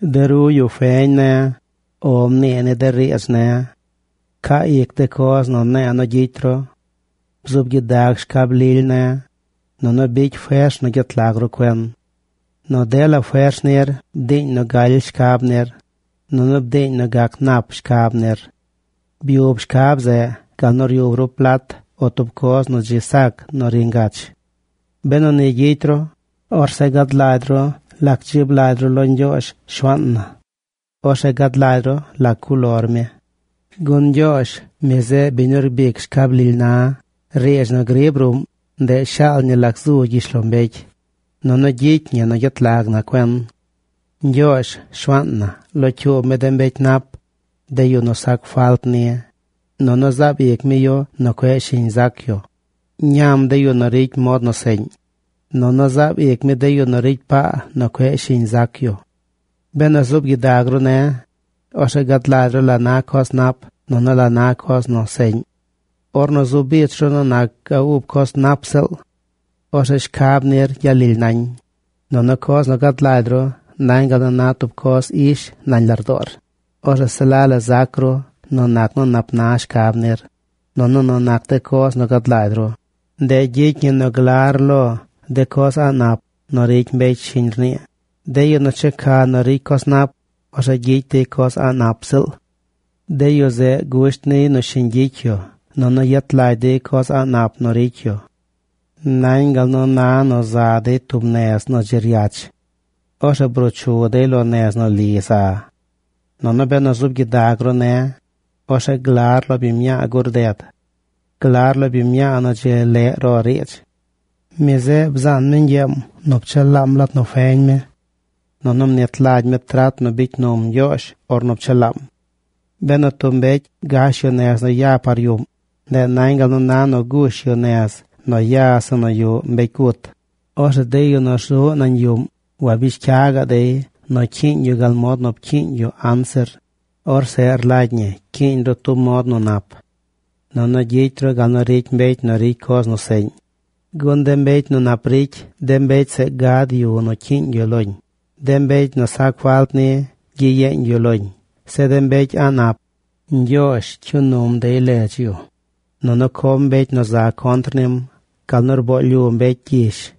De ru yu feñ ne̱, “O” mnii ni de riidz ne̱. Pcaa ic de coz nu ne̱e̱ nu gyicy ru. Bzuub gyidag shcab lily ne̱, nunu bicy fers nu gyet lag ru cuen. Nu dela fers nir bdiiñ nu galy shcab nir, nunu bdiiñ nu gac nap shcab nir. Byub shcab zeꞌ gal nu ryub ru plat o tub coz nu dzi sac nu ri ngach. Benu ni gyicy ru, orzeꞌ gad lagy ru lac dzib lagy ru lo Ñgyoozh, Shuaan na. Orzeꞌ gad lagy ru lac cuꞌ lor mi. Gun Ñgyoozh, mi zeꞌ biñ nu rbic shcab lily na. Riidz nu griib ruꞌm, ndeꞌ shaal ñi lac zu gyishlombecy, nunu gyicy ñi nu gyet lag na cuen. Ñgyoozh, Shuaan na, locyuub mi de mbecy nap, de yu nu sac falt ni, nunu zaab ic mi yu nu cueꞌ shiñ zac yu. Ñam de yu nu ricy mod nu seꞌñ, nunu zaab ic mi de yu nu ricy paa nu cueꞌ shiñ zac yu. Benu zuub gyidag ru ne̱, orzeꞌ gad lagy ru la na coz nap nunu la na coz nu seꞌñ. Orzeꞌ zu bich ru nu nac ga ub coz nap ziꞌl. Orzeꞌ shcab nir gyalily nañ, nunu coz nu gad lagy ru nañ gal nu na tub coz ish nañ lardoor. Orzeꞌ se la la zac ru nu nac nu nap na shcab nir, nunu nu nac de coz nu gad lagy ru. Ndeꞌ gyicy ñi nu glar lo de coz a̱ꞌ nap nu ricy mbecy shiñ rnii, de yu nu checa nu ricy coz nap. Orzeꞌ gyicy dey coz a̱ꞌ nap ziꞌl. De yu zeꞌ gusht niy nu shiñ gyicy yu, nunu yet lagy dey coz a̱ꞌ nap nu ricy yu. Nañ gal nu na nu za dey tub nez nu dzi ryach. Orzeꞌ bruu chu dey lo nez nu li za. Nunu benu zuub gyidag ru ne̱, orzeꞌ glar lo biñ mñaa gur ded. Glar lo biñ mñaa nu dzi leꞌ ro riidz. Mi zeꞌ bzaan mi ñgyeem nu pchelaam lat nu feñ mi. Nunu mnit lagy mi trat nu bicy num Ñgyoozh ornu pchelaam. Benu tub mbecy gash yu nez nu ya par yuꞌm, ndeꞌ nañ gal nu na nu gush yu nez nu ya zeꞌ nu yuꞌ mbecy gut. Orzeꞌ de yu nu rzuꞌ nañ yuꞌm wabish cya gaꞌ dey nu cyiiñ yu gal mod nu pcyiiñ yu anzir. Orzeꞌ rlagy ñi cyiiñ ru tub mod nu nap. Nunu gyicy ru gal nu ricy mbecy nu ricy coz nu seꞌñ. Gun de mbecy nu nap ricy, de mbecy zeꞌ gad yu nu cyiiñ yu loñ. De mbecy nu sac falt ni, gyiyeeñ yu loñ. Zeꞌ de mbecy a̱ꞌ nap Ñgyoozh cyuu num dey ledz yu, nunu com mbecy nu za contr nim gal nu rboo lyu mbecy gyish.